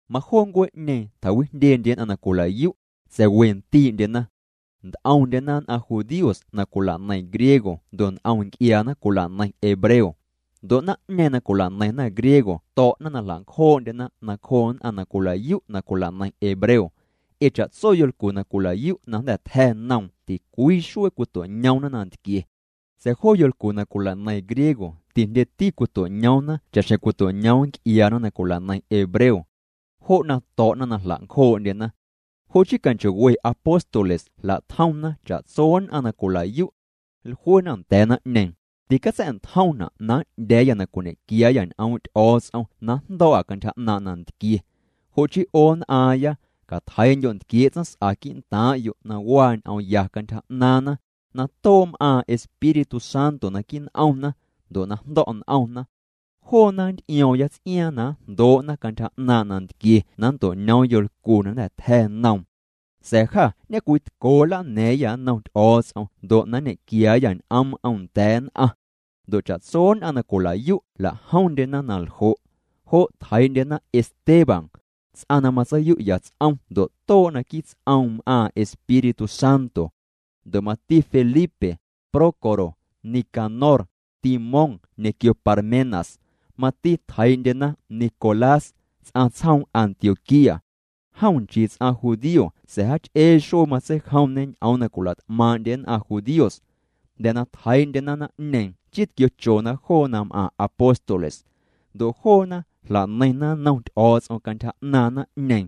Majoo ncuee'ñeeⁿ tjawijndyendye nn'aⁿ na cwila'yu'. Sa̱a̱ we ndi'ndyena. Nt'omndyena nn'aⁿ judíos na cwila'neiⁿ griego ndo' nt'om nc'iaana cwila'neiⁿ hebreo. Ndo' naⁿ'ñeeⁿ na cwila'neiⁿna griego to̱'na na jla'ncjoo'ndyena nacjoo' nn'aⁿ na cwilayu' na cwila'neiⁿ hebreo. Ee cha'tso yolcu na cwila'yu' na jnda̱ tja̱ noom ticwii xuee cwito'ñoomna nantquie. Sa̱a̱ joo yolcu na cwila'neiⁿ griego tijndyeti cwito'ñoomna cha'xjeⁿ cwito'ñoom nc'iaana na cwila'neiⁿ hebreo. Jo' na to̱'na na jla'ncjoo'ndyena. Jo' chii canchoo'we apóstoles jla'tjomna cha'tso nn'aⁿ na cwila'yu'. Jluena nda̱a̱ naⁿ'ñeeⁿ: —Ticatsa̱'ntjomna' na n'ndya̱a̱yâ na cwiñe'quiaayâ ñ'oom' Ty'o̱o̱ts'om na njndo̱o̱'â cantyja 'naaⁿ' nantquie. Jo' chii 'o nn'aaⁿya, catjeii'ndyo' ntquiee' tsaⁿs'a quii'ntaaⁿ'yo' na waa ñ'oom ya cantyja 'naaⁿna, na too' m'aaⁿ Espíritu Santo naquii' n'omna, ndo' na jndo̱' n'omna. Joona nnt'io̱o̱ⁿya ts'iaaⁿ na njndoo'na cantyja 'naaⁿ' nantquie na nnto'ñoom yolcu na jnda̱ tja̱ noom. Sa̱a̱ jâ ñecwitco nlana̱a̱ⁿyâ nnom Ty'o̱o̱ts'om ndo' na nñequiaayâ ñ'oom'm nda̱a̱ nn'aⁿ. Ndo' cha'tso nn'aⁿ na cwila'yu' jla'jomndyena na ljo'. Jo' tjeii'ndyena Esteban, ts'aⁿ na matseiyu'ya ts'om ndo' too' naquii' ts'oom m'aaⁿ Espíritu Santo. Ndo' mati Felipe, Prócoro, Nicanor, Timón ñequio Parmenas. Mati tjeii'ndyena Nicolás, ts'aⁿ tsjoom Antioquía. Jom nchii ts'aⁿ judío sa̱a̱ jaach'ee xuee matseijomñê ñ'oom na cwila't'maaⁿ'ndye nn'aⁿ judíos. Jnda̱ na tjeii'ndyena naⁿ'ñeeⁿ chii tquiochona joo na m'aⁿ apóstoles. Ndo' joona jla'neiⁿna nnom Ty'o̱o̱ts'om cantyja 'naaⁿ naⁿ'ñeeⁿ.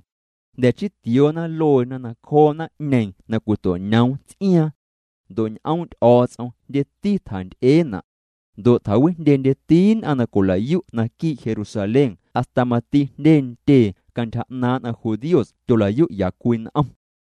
Jnda̱ chii tioona lueena nacjoo naⁿ'ñeeⁿ na cwito'ñoom ts'iaaⁿ. Ndo' ñ'oom' Ty'o̱o̱ts'om jndyeti tjanty'eena'. Ndo' ty'ewijndyendyeti nn'aⁿ na cwila'yu' naquii' Jerusalén hasta mati jndye ntyee cantyja 'naaⁿ nn'aⁿ judíos tyola'yu'ya cwii n'om.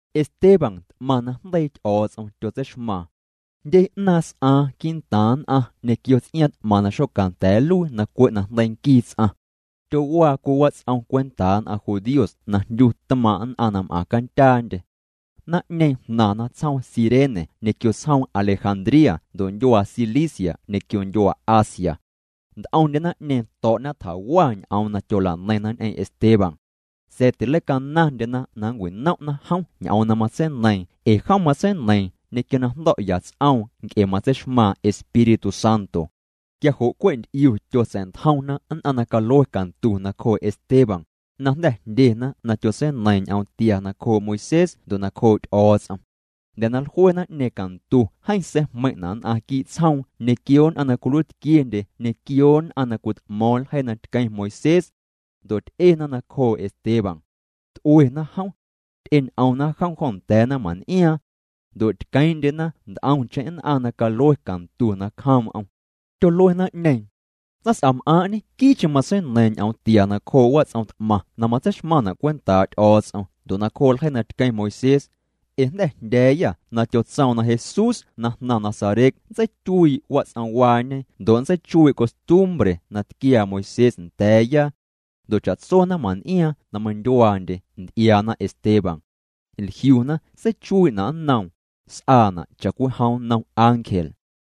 Esteban t'maⁿ najndeii Ty'o̱o̱ts'om tyotseixmaaⁿ. Jndye 'naaⁿ s'aaⁿ quii'ntaaⁿ nn'aⁿ ñequio ts'iaaⁿ t'maⁿ na xocanda̱a̱ nluii na cwe' najndeii nquii ts'aⁿ. Tyowaa cwii wats'om cwentaa nn'aⁿ judíos na jndyu tmaaⁿ' nn'aⁿ m'aⁿcandyaa'ndye. Naⁿ'ñeeⁿ jnaⁿna tsjoom Cirene ñequio tsjoom Alejandría ndo' ndyuaa Cilicia ñequio ndyuaa Asia. Nt'omndye naⁿ'ñeeⁿ to̱'na tjawa ñ'oom na tyola'neiⁿna ñ'eⁿ Esteban. Sa̱a̱ tileicanaⁿndyena na nncwinom'na jom ñ'oom na matseineiiⁿ ee jom matseineiiⁿ ñequio na jndo̱'ya ts'oom nc'e matseixmaaⁿ Espíritu Santo. Quia jo' cwe' nt'iu tyotsa̱'ntjomna nn'aⁿ na calue cantu nacjoo' Esteban, na jnda̱ jndyena na tyotseineiiⁿ ñ'oom tia nacjoo' Moisés ndo' nacjoo' Ty'o̱o̱ts'om. Jnda̱ na jlue naⁿ'ñeeⁿ cantu jeeⁿ seijmeiⁿ'na' nn'aⁿ quii' tsjoom ñequio nn'aⁿ na cwiluiitquiendye ñequio nn'aⁿ na cwit'mo̱o̱ⁿ ljeii na tqueⁿ Moisés. Ndo' ty'ena nacjoo' Esteban. T'uena jom. Ty'eñ'omna jom jo nda̱a̱ naⁿmaⁿn'iaaⁿ. Ndo' tqueeⁿ'ndyena nt'omcheⁿ nn'aⁿ na calue cantu nacjoom'm. Tyolue naⁿ'ñeeⁿ: —Tsaⁿs'am'aaⁿ' ñequii'cheⁿ matseineiiⁿ ñ'oom tia nacjoo' wats'om t'maⁿ na matseixmaⁿna' cwentaa' Ty'o̱o̱ts'om ndo' nacjoo' ljeii na tqueⁿ Moisés. Ee jnda̱ jndya̱a̱yâ na tyotsoom na Jesús na jnaⁿ Nazaret nntseityuii' wats'omwaañe ndo' nntseichuii' costumbre na tquiaa Moisés nda̱a̱ya. Ndo' cha'tso naⁿmaⁿn'iaaⁿ na meindyuaandye nty'iaana Esteban. Jliuna seichuii'na' nnoom, s'aana' cha'cwijom nnom ángel.